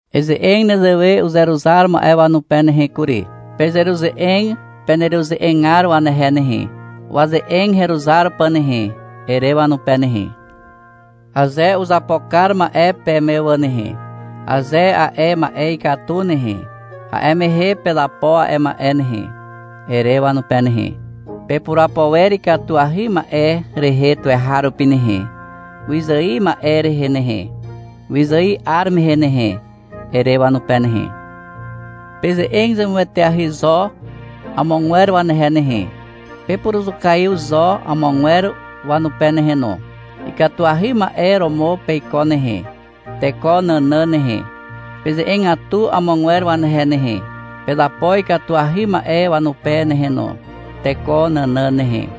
Eze'eg nezewe uzeruzar ma'e wanupe nehe kury. — Pezeruze'eg peneruze'egar wanehe nehe, waze'eg heruzar pà nehe, ere wanupe nehe. — Aze uzapo kar ma'e peme wà nehe, aze a'e ma'e ikatu nehe, a'e mehe pezapo a'e ma'e nehe, ere wanupe nehe. — Pepurapo wer ikatuahy ma'e rehe tuweharupi nehe, wyzài ma'e rehe nehe, wyzài 'ar mehe nehe, ere wanupe nehe. Peze'eg zemueteahy zo amogwer wanehe nehe. Pepuruzukaiw zo amogwer wanupe nehe no. Ikatuahy ma'e romo peiko nehe, teko nànàn nehe. Peze'egatu amogwer wanehe nehe. Pezapo ikatuahy ma'e wanupe nehe no, teko nànàn nehe.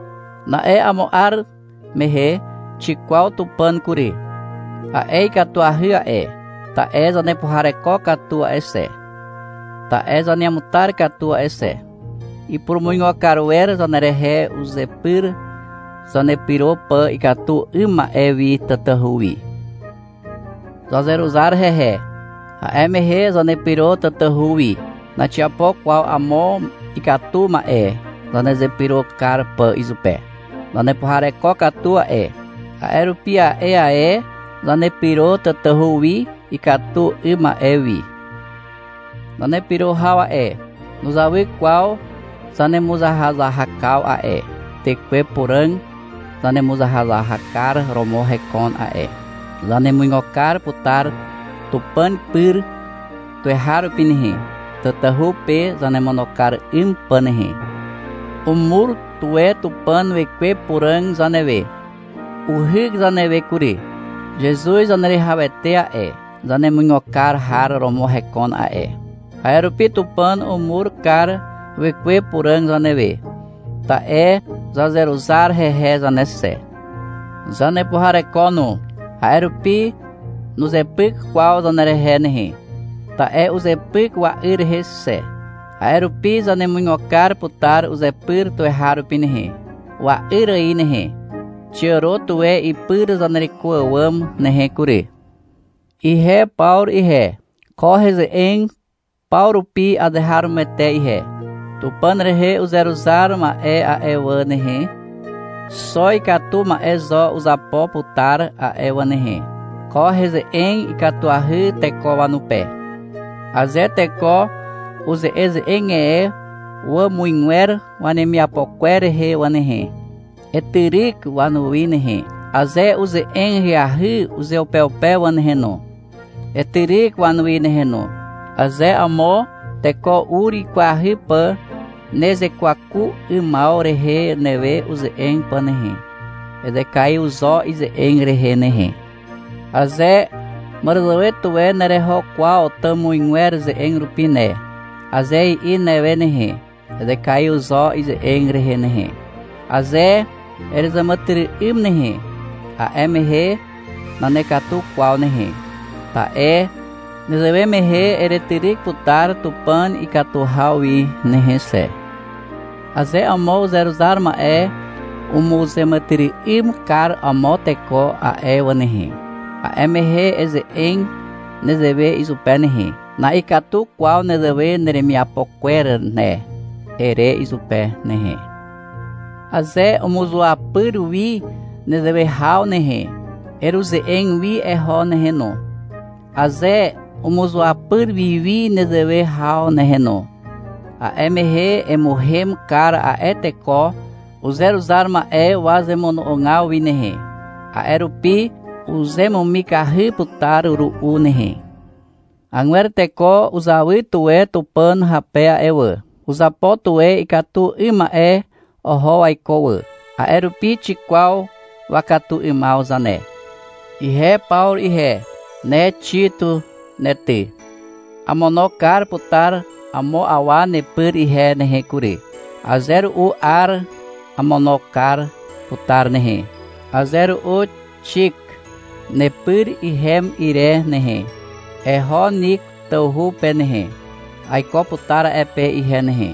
Na'e amo 'ar mehe xikwaw Tupàn kury. A'e ikatuahy a'e, ta'e zanepuhareko katu a'e xe, ta'e zaneamutar katu a'e xe. Ipurumuigo kar wer zanerehe uzepyr, zanepyro pà ikatu 'ym ma'e wi tatahu wi. Zazeruzar hehe. A'e mehe zanepyro tatahu wi. Naxiapo kwaw amo ikatu ma'e zanezepyro kar pà izupe. Zanepuhareko katu a'e. A'e rupi a'e ae zanepyro tatahu wi ikatu 'ym ma'e wi. Zanepyro haw a'e, nuzawy kwaw zanemuzahazahakaw a'e. Tekwe Puràg zanemuzahazahakar romo hekon a'e. Zanemuigo kar putar Tupàn pyr tuweharupi nehe, tatahu pe zanemono kar 'ym pà nehe. Umur tuwe Tupàn Wekwe Puràg zanewe. Uhyk zanewe kury. Zezuz Zaneruwihawete a'e, zanemuigo kar har romo hekon a'e. A'e rupi Tupàn umur kar Wekwe Puràg zanewe, ta'e zazeruzar hehe zane xe. Zanepuhareko no. A'e rupi nuzepyk kwaw zanerehe nehe, ta'e uzepyk wa'yr rehe xe. A'e rupi zanemuigo kar putar uzepyr tuweharupi nehe, wa'yr ài nehe. Xiàro tuwe ipyr zanereko àwàm nehe kury. Ihe Pawru ihe, ko heze'eg paw rupi azeharomoete ihe. Tupàn rehe uzeruzar ma'e a'e wà nehe, xo ikatu ma'e zo uzapo putar a'e wà nehe. Ko heze'eg ikatuahy teko wanupe. Aze teko uze'eze'eg e wàmuzgwer wanemiapo kwer rehe wà nehe, etyryk wanuwi nehe. Aze uze'eg ahyahy uzeupeupe wà nehe no, etyryk wanuwi nehe no. Aze amo teko ur wikwahy pà nezekwaku 'ymaw rehe newe uze'eg pà nehe, ezekaiw zo ize'eg rehe nehe. Aze — Màràzàwe tuwe nereho kwaw tàmuzgwer ze'eg rupi ne, aze i'i newe nehe, ezekaiw zo ize'eg rehe nehe. Aze erezàmàtyry'ym nehe, a'e mehe nanekatu kwaw nehe, ta'e nezewe mehe eretyryk putar Tupàn ikatu haw wi nehe xe. Aze amo uzeruzar ma'e umuzeàmàtyry'ym kar amo teko a'e wà nehe, a'e mehe eze'eg nezewe izupe nehe. — Na'ikatu kwaw nezewe neremiapo kwer ne, ere izupe nehe. Aze umuzuapyr wi nezewe haw nehe, eruze'eg wi eho nehe no. Aze umuzuapyr wiwi nezewe haw nehe no, a'e mehe emuhem kar a'e teko uzeruzar ma'e wazemono'ogaw wi nehe. A'e rupi uzemumikahy putar ru'u nehe. Agwer teko uzawy tuwe Tupàn hape a'e wà. Uzapo tuwe ikatu 'ym ma'e oho waiko wà, a'e rupi xikwaw wakatu 'ymaw zane. Ihe Pawru ihe, ne Xit ne ty. Amono kar putar amo awa nepyr ihe nehe kury. Aze ru'u Ar amono kar putar nehe, aze ru'u Xik. Nepyr ihem ire nehe, eho Niko tawhu pe nehe. Aiko putar a'e pe ihe nehe,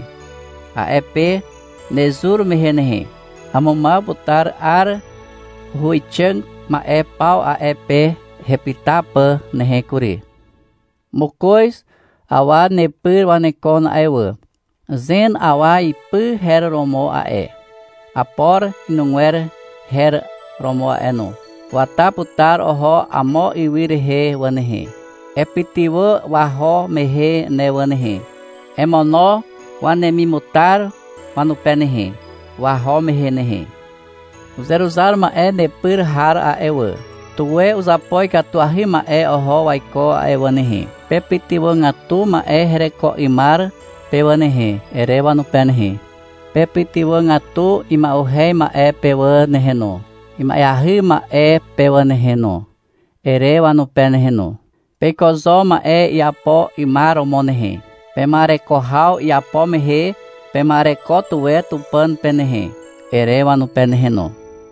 a'e pe nezur mehe nehe. Amumaw putar 'ar huwixàg ma'e paw a'e pe hepyta pà nehe kury. Mokoz awa nepyr wanekon a'e wà. Zen awa ipy her romo a'e. Apor inugwer her romo a'e no. Wata putar oho amo ywy rehe wà nehe. Epytywà waho mehe ne wà nehe. Emono wanemimutar wanupe nehe, waho mehe nehe. Uzeruzar ma'e nepyr har a'e wà, tuwe uzapo ikatuahy ma'e oho waiko a'e wà nehe. — Pepytywàgatu ma'e hereko 'ymar pe wà nehe, ere wanupe nehe. — Pepytywàgatu ima'uhez ma'e pe wà nehe no, ima'eahy ma'e pe wà nehe no, ere wanupe nehe no. — Peiko zo ma'e iapo 'ymar romo nehe. Pema'ereko haw iapo mehe pema'ereko tuwe Tupàn pe nehe, ere wanupe nehe no.